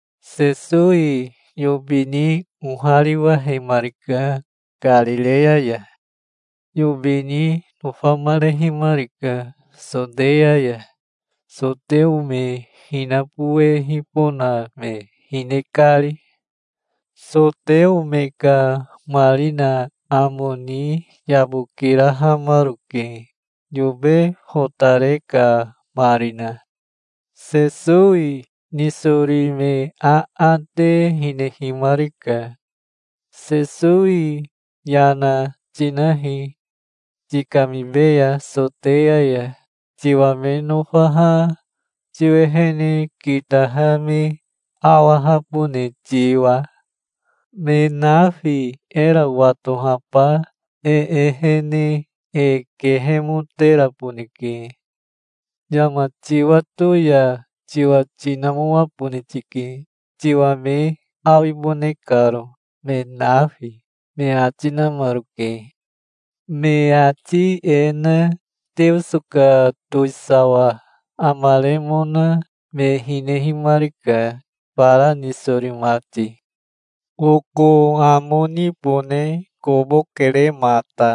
Sesowi yobi ni ohariwahemarika Karireya ya. Yobi ni nofamarehimarika Soteya ya, soteo me hinabowehibona me hine kari. Soteo me ka marina amo ni yabokirahamaroke, yobe fotare ka marina. Sesowi nisori me aate hinehimarika. "Sesowi yana tinahi. Tikamibeya Soteya ya, tiwa me nofaha tiwehene kitaha me awahabone tiwa. Me nafi era watohaba e ehene e kehemoteraboneke. Yama tiwato ya tiwa tinamoabone tike, tiwa me awibone karo, me nafi", me ati namaroke. Me ati e na Teoso ka towisawa amaremona me hinehimarika, fara nisori mati. "Oko amo nibone kobo kere mata.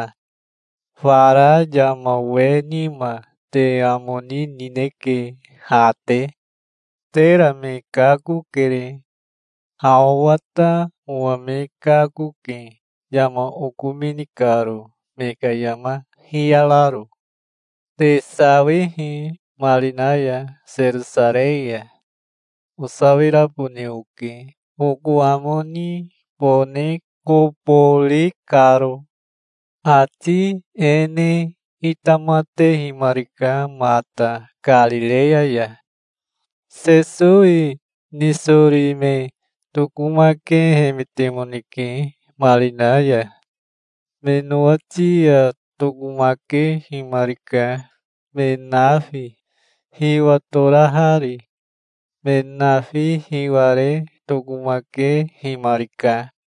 Fara yama we nima te amo ni nineke ha te. Tera me kakokere. Ha owa ta owa me kakoke, yama okomini karo me ka yama hiyararo. Te sawihi marina ya Serosarei ya. Osawirabone oke, oko amo nibone kobo ri karo". Ati e ne itamatehimarika mata Karireya ya. Sesowi nisori me tokomakehemetemoneke marina ya. Me nowati ya tokomakehimarika, me nafi hiwatorahari. Me nafi hiware tokomakehimarika.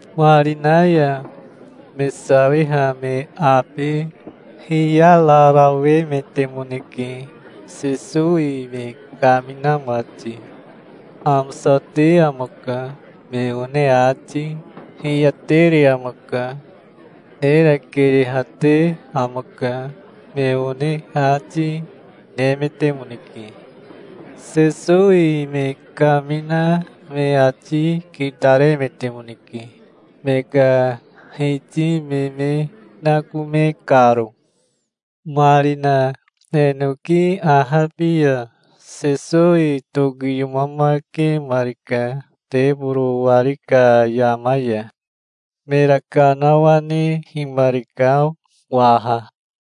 Marina ya me sawiha me abe hiyararawemetemoneke, Sesowi me kamina mati. "Amosate amaka", me one ati, "Hiyatere amaka. Era keyehate amaka", me one ati, nemetemoneke. Sesowi me kamina me ati kitaremetemoneke, me ka hiti me me nakome karo. Marina enoki ahabi ya Sesowi tokiyomamakemarika teboro wari ka yama ya. Mera kanawanehimarika waha.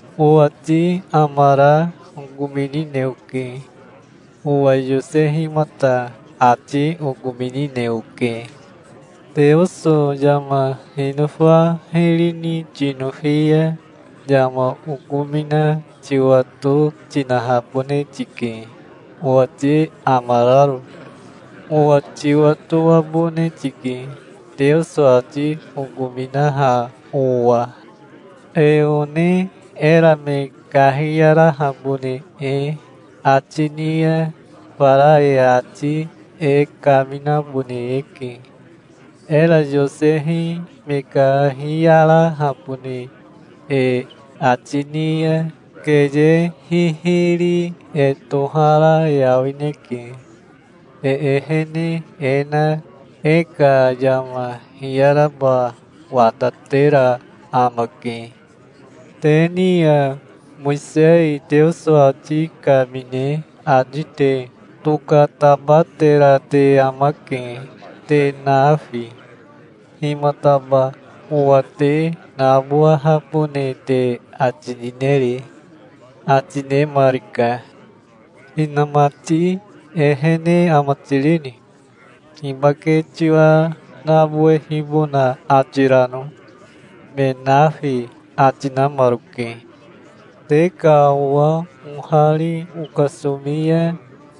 "Owati amara okominine oke. Owa yosehimata ati okominine oke. Teoso yama hinofa hiri ni tinofi ya yama okomina tiwato tinahabone tike, owati amararo. Owa tiwatoabone tike, Teoso ati okominaha owa. E one era me kahiyarahabone e ati ni ya fara e ati e kaminabone eke. Era yosehi me kahiyarahabone e ati ni ya keye hihiri e tohara awineke. E ehene e na e ka yama hiyaraba watatera amake. Te ni ya Mowisei Teoso ati kamine ati te tokatabatera te amake, te nafi. Himataba owa te nabowahabone te ati nineri?" ati nemarika. "Inamati ehene ama tirini? Hibake tiwa nabowehibona ati rano?" me nafi ati namaroke. "Te ka owa ohari okasomi ya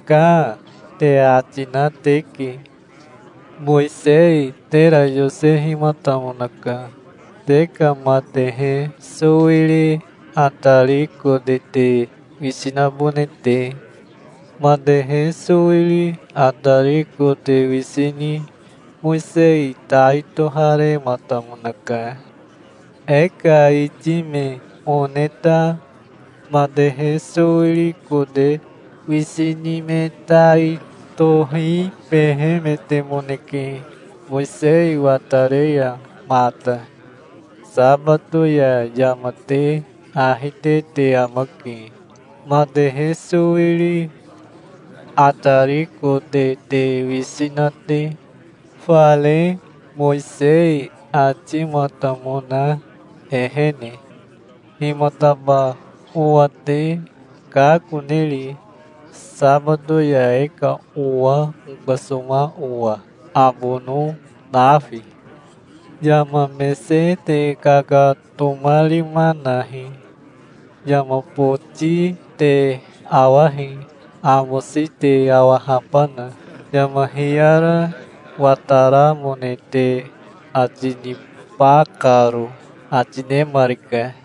'Kaa', te ati na teke. Mowisei tera yosehimatamonaka, te ka matehe sowiri atari kote te wisi nabone te. Matehe sowiri atari kote wisi ni Mowisei tai toharematamonaka. E ka iti me one ta matehe sowiri kote wisi ni me tai tohibehemetemoneke, Mowisei watare ya mata. Sabato ya yama te ahi te te amake, matehe sowiri atari kote te wisi na te, fare Mowisei atimatamona ehene. Himataba owa te kakoneri, sabato ya e ka owa okasoma owa, abono nafi? Yama mese te kakatomarima nahi. Yama boti te awahi, amosi te awahabana, yama hiyara wataramone te ati niba karo", ati nemarika.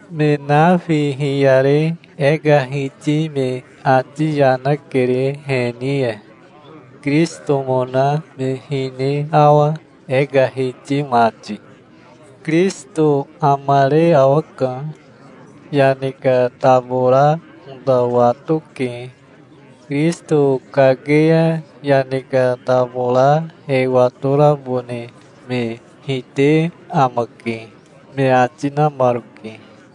Me nafi hiyare e ka hiti me ati yana kere he ni ya. Kirisitomona me hine awa, e ka hiti mati? Kirisito amare awaka. Yane ka tabora ota watoke. Kirisito kake ya yane ka tabora e watorabone me hite amake", me ati namaroke.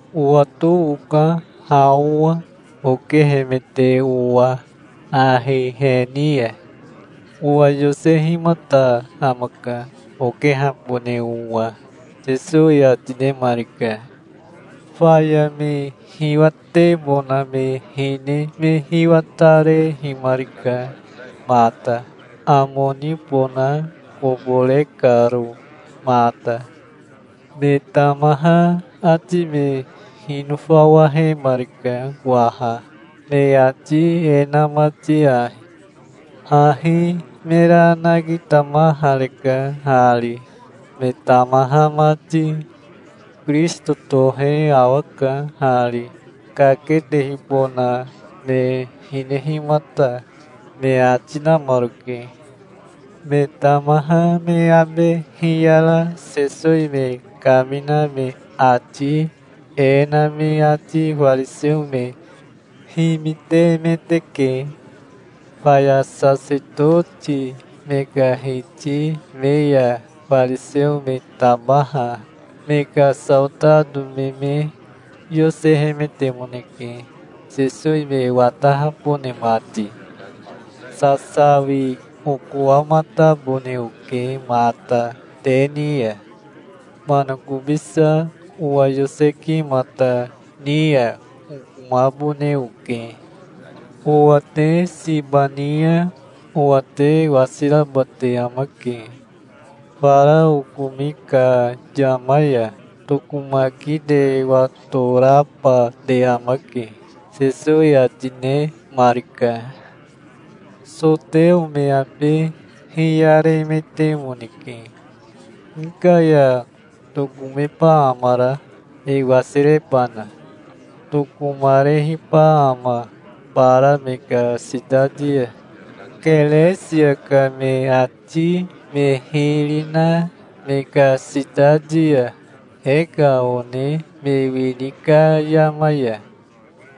Owato oka ha owa, okehemete owa ahi he ni ya. Owa yosehimata amaka, okehabone owa", Sesowi ati nemarika. Faya me hiwatebona me hine me hiwatarehimarika mata, amo nibona kobo re karo mata. Me tamaha ati me hinofawahemarika waha, me ati e na mati ahi: "Hahi mera nakitamahareka hari, me tamaha mati. Kirisito tohe awaka hari, kaketehibona me hinehimata", me ati namaroke. Me tamaha me abe hiyara Sesowi me kamina me ati e na me ati fariseo me himitemeteke. Faya sasetoti me ka hiti me ya fariseo me tabaha me ka saotato me me yosehemetemoneke, Sesowi me watahabone mati. "Sasawi okowamatabone oke mata te ni ya. Manakobisa owa yosekimata ni ya okomabone oke. Owa te siba ni ya owa te wasiraba te amake. Fara okomi ka yama ya tokomaki te watoraba te amake", Sesowi ati nemarika. Soteo me abe hiyaremetemoneke. "Hika ya tokomeba amara, e wasirebana? Tokomarehiba ama bara me ka sitati ya, Keresia ka me ati me hiri na me ka sitati ya, e ka one me wini ka yama ya?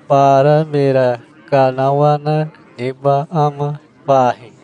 Bara mera kanawana neba ama fahi?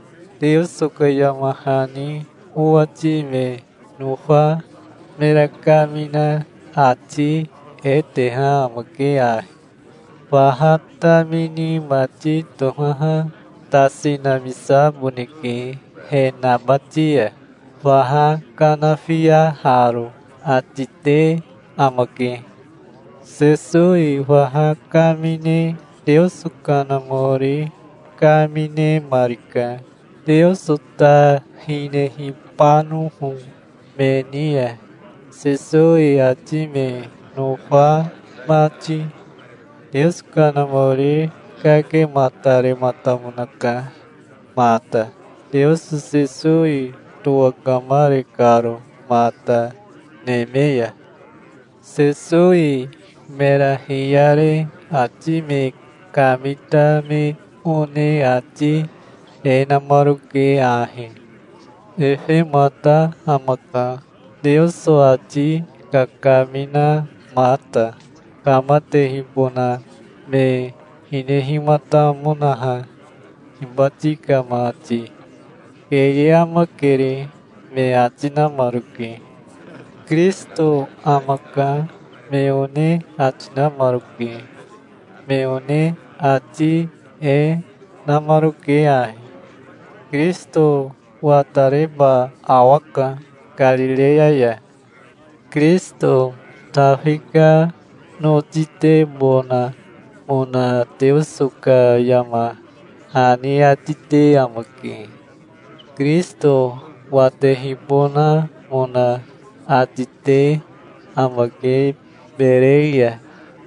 Teoso ka yama hani owati me nofa mera kamina ati e teha amake ahi: 'Faha tamini mati tohaha tasi namisaboneke he nabati ya, faha kanafiaharo', ati te amake". Sesowi faha kamine Teoso Kanamori kaminemarika, Teoso ta hinehibanoho me ni ya, Sesowi ati me nofa mati. Teoso Kanamori kakematarematamonaka mata, Teoso Sesowi towakamare karo mata neme ya. Sesowi mera hiyare ati me kamita me one ati e namaroke ahi: "Efemata amaka, Teoso ati kakaminamata, kamatehibona me hinehimatamonaha hibati ka mati. Keye amakere", me ati namaroke. "Kirisito amaka", me one ati namaroke. Me one ati e, namaroke ahi: "Kirisito watareba awaka Karireya ya. Kirisito Tafi ka notitebonamona Teoso ka yama hani ati te amake. Kirisito watehibonamona ati te amake Berei ya,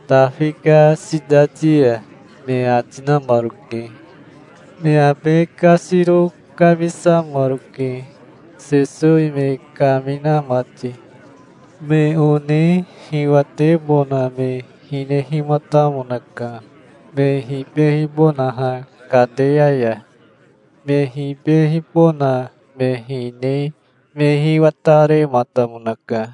Tafi ka sitati ya", me ati namaroke. Me abe kasiro kamisamaroke, Sesowi me kamina mati. Me one hiwatebona me hinehimatamonaka, me hibehibonaha kateya ya. Me hibehibona me hine me hiwatarematamonaka.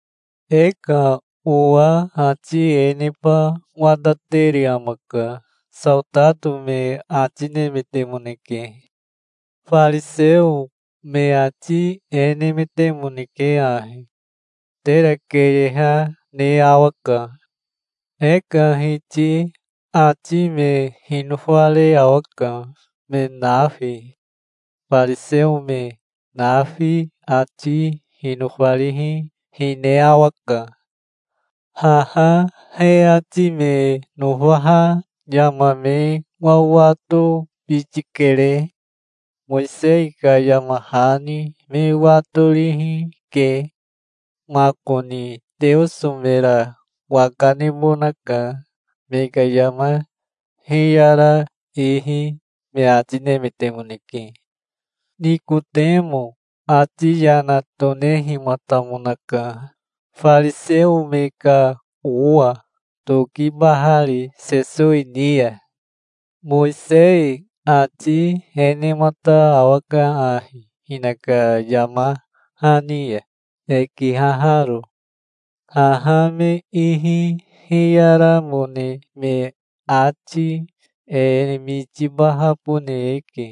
"E ka owa ati e neba watatere amaka", saotato me ati nemetemoneke. Fariseo me ati e nemetemoneke ahi: "Tera keyeha ne awaka. E ka hiti ati me hinofare awaka, me nafi. Fariseo me nafi ati hinofarihi, hine awaka. Haha he ati me nofaha yama me wawatobiti kere. Mowisei ka yama hani me watorihi ke. Makoni Teoso mera waka nebonaka me ka yama hiyara ihi", me ati nemetemoneke. Nikotemo ati yana tonehimatamonaka, fariseo me ka owa, tokibahari Sesowi ni ya. "Mowisei ati e nemata awaka ahi hinaka yama hani ya, e kihaharo. Haha me ihi hiyaramone me ati e mitibahabone eke,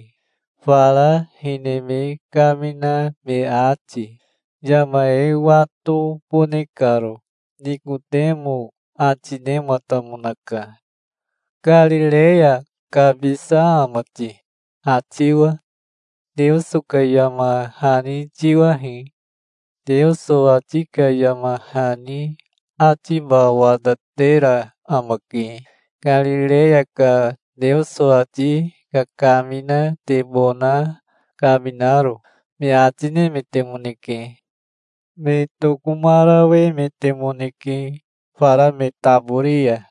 fara hine me kamina me ati, yama e watobone karo", Nikotemo ati nematamonaka. "Karireya kabisa ama ti, ha tiwa? Teoso ka yama hani tiwahi. Teoso ati ka yama hani atiba watatera amake, Karireya ka Teoso ati kakaminatebona kaminaro", me ati nemetemoneke. Me tokomarawemetemoneke fara me tabori ya.